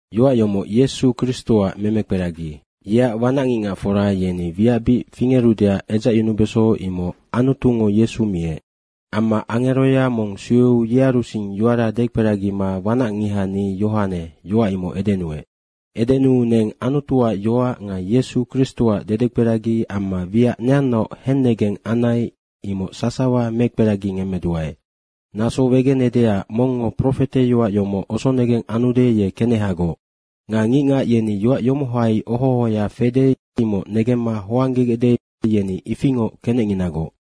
Yoac yomoc Yesu Kristoac memekperagi. Yeac wanac ngicngacfora yeni wiac bic fingerudeac edzacyunubeso imoc Anutungo Yesu miec. Amma angeroya mong sueu yearusing yoara dekperagima wanacngiha ni Yohane, yoac imoc edenuec. Edenuu neng Anutuac yoac nga Yesu Kristoac dedekperagi amma wiac neannaoc hennegeng anai, imoc sasawa mekperagingemmeduae. Naso wegenedeac mongngo profeteyoac yomoc osonegeng anude, ye kenehagoc. Nga ngicngac yeni yoac yomohai oho ohoya fede, imoc negemma hoanggegecde, yeni ifingoc kenecnginagoc.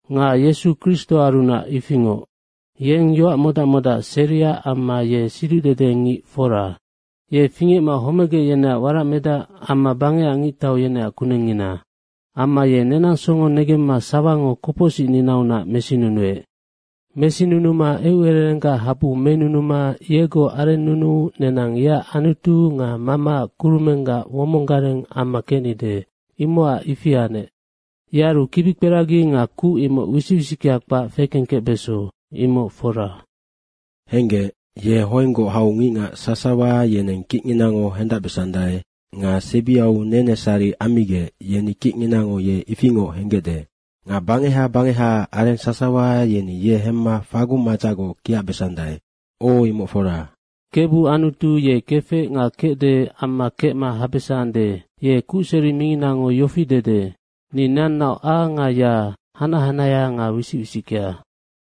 Nga Yesu Kristoarunac ifingoc. Yeng yoac modac modac seria amma ye siducdedengic fora. Ye fingecma homegec yeneac waracmedac amma bangecac ngictau yeneac kunengngina. Amma ye nenang songo negemma sawango kopocsicninaunac mesinunuec. Mesinunuma eucererenggac habu menunuma yegoc arennunuu neni yeac Anutu nga Mamaac kurumenggac womong gareng amma kecnide, imocac ifi anec. Yearu kibikperagi nga kuc imoc wisic wisickea kpac fekengkecbeso, imoc fora. Henggec, ye hoenggoc hau ngicngac sasawa yeneng kicnginango hendacbesandae nga sebiau nenesari ammigec, yeni kicnginango ye ifingoc henggecde. Nga bangeha bangehaac areng sasawa yeni ye hemma fagung madzacgoc kiacbesandae. O, imoc fora. Kebu Anutu ye kefec nga kecdenoc amma kecma habesande, ye Kucseri minginango yofi dede, “Ni neannaoc A nga Y, hanac hanahea nga wisic wisickea.”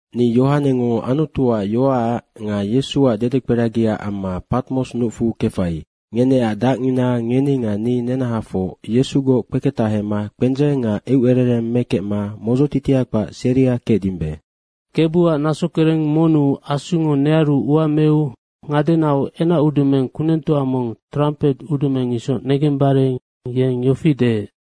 Ni Yohanengo Anutuac yoacac nga Yesuac dedekperagiac amma Patmos nucfu kefai. Ngeneac dacngina, ngeni nga ni nenahafoc Yesugoc kpeketahema kpendzeng nga eucerereng mekecma modzotitia kpac seria kecdimbe. Kebuac naso kereng monnu Asungo nearu ua meu ngadenau enacudumeng kunengtoa mong trampet udumeng isoc negembare yeng yofi deec,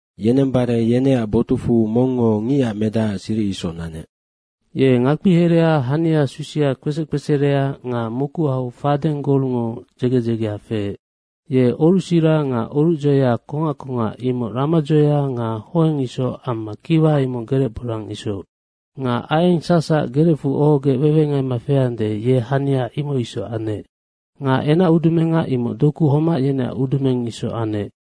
Yenembare yeneac botucfu mongngo Ngicac Medacac siric isoc nanec. Ye ngakpia herea hani susia kpesec kpeserea nga mokuhau fadeng golngo dzege dzegea feec. Ye orucsira nga orucdzoeya kongac kongac imoc ramadzoeya nga hoeng isoc amma kiwa imoc gerec borang isoc. Nga aieng sacsac gerecfu ohogec wewengaima feande, ye hania imoc isoc anec. Nga enacudumenga, imoc doku homac yeneac udumeng isoc anec.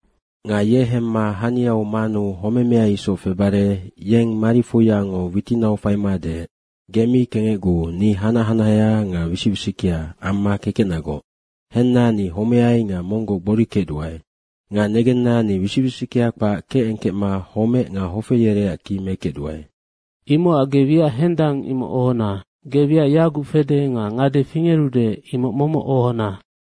Nga ye hemma haniau manuu homemea isoc febare yeng marifoiango witinau faima deec, “Ge mi kengecguu, ni hanac hanahea nga wisic wisickea amma kekecnagoc. Henna, ni homeai nga monggoc gbori kecduae. Nga negenna, ni wisic wisickea kpac kecengkecma homec nga hofe yereac ki mekecduae. Imocac ge wiac hendang imoc ohona. Ge wiac yaguc fede nga ngade fingerude, imoc momoc ohona.